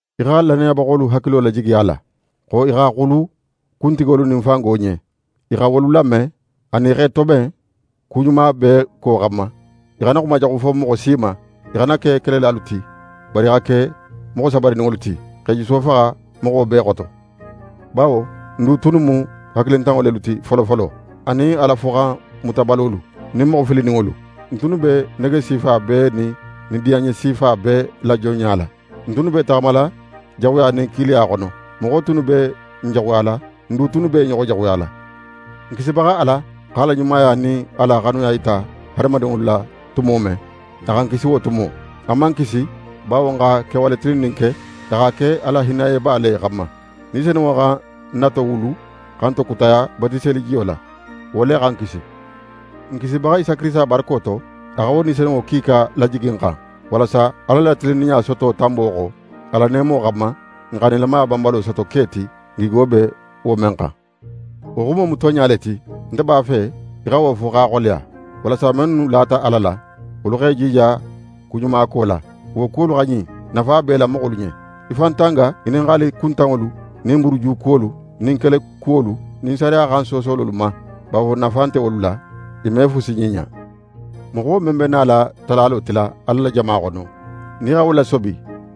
Í xa lannayabaxolu hakilo lajigi a la, xo i xa xulu kuntigolu nin fango ɲen. I xa wolu lame, anin i x'e toben ku ɲuma bee ko xanma. I xana xumajaxu fo moxo si ma, i xana ke kelelalu ti, bari i xa ke moxo sabarininŋolu ti, x'e juso faxa moxo bee xoto. Bawo n du tunnu mu hakilintanŋo lelu ti folofolo, anin Ala foxanmutabalolu, nin moxo filininŋolu. N tunnu be nege sifa bee nin nidiyanɲe sifa bee la jonɲa la. N tunnu b'e taxamala jaxuya nin kiiliya xono. Moxo tunnu be n jaxuyala, n du tunnu b'e ɲoxo jaxuyala. N Kisibaxa Ala x'a la ɲumaya nin a la xanuya yita hadamadinŋolu la tumo men, a xa n kisi wo tumo. A man n kisi bawo n xa kewale tilinnin ke; a x'a ke a la hinnayeba le xanma. Ni Senunŋo xa n na towulu xa n tokutaya batiselijiyo la. Wo le xa n kisi. N Kisibaxa Isa Kirisita barako to, a xa wo Ni Senunŋo kiika lajigi n xan, walasa Ala la tilinninɲa soto tanbo xo, a la neemo xanma, n xa nilamaya banbalo soto ke ti, n gigo be wo men xan. Wo xumo mu tonɲa le ti. Nte b'a fe í xa wo fo x'a xoleya, walasa mennu lata Ala la, wolu x'e jija kuɲumako la. Wo kuwolu xa ɲin; nafa b'e la moxolu ɲen. Í fan tanga ŋininxali kuntanŋolu nin buruju kuwolu nin kele kuwolu nin sariya xan soosololu ma; bawo nafa nte wolu la, i me fusi ɲiɲa. Moxo men be nala talalo tila Ala la jama xono, nin í xa wo lasobi,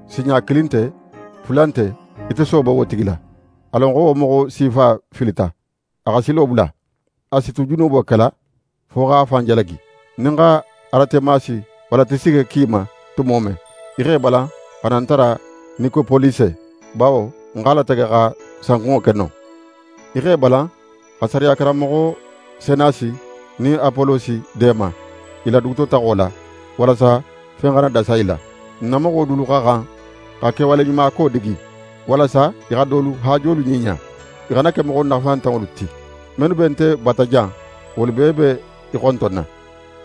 sinɲa kilin nte, fula nte, í tosoobo wo tigi la. A lon xo wo moxo sifa filita, a xa silo bula. A si tu junubo kela, fo x'a fan jalagi. Nin ń xa Aratemasi walla Tisike ki í ma tumo men, í x'é balan xa na ń tara Nikopolise, bawo ń x'a latege xa sankunŋo ke non. Í x'é balan xa sariya karanmoxo Senasi nin Apolosi deema í la dugutotaxo la, walasa fen xana dasa i la. N na moxo dulu xa xan xa kewaleɲumako digi; walasa i xa dolu haajolu ɲiɲa. I xana ke moxo nafantanŋolu ti. Mennu be nte bata jan, wolu bee be í xontonna.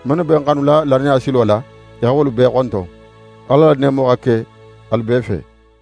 Mennu be n xanula lannaya silo la, í xa wolu bee xonton. Ala la neemo xa ke alu bee fe.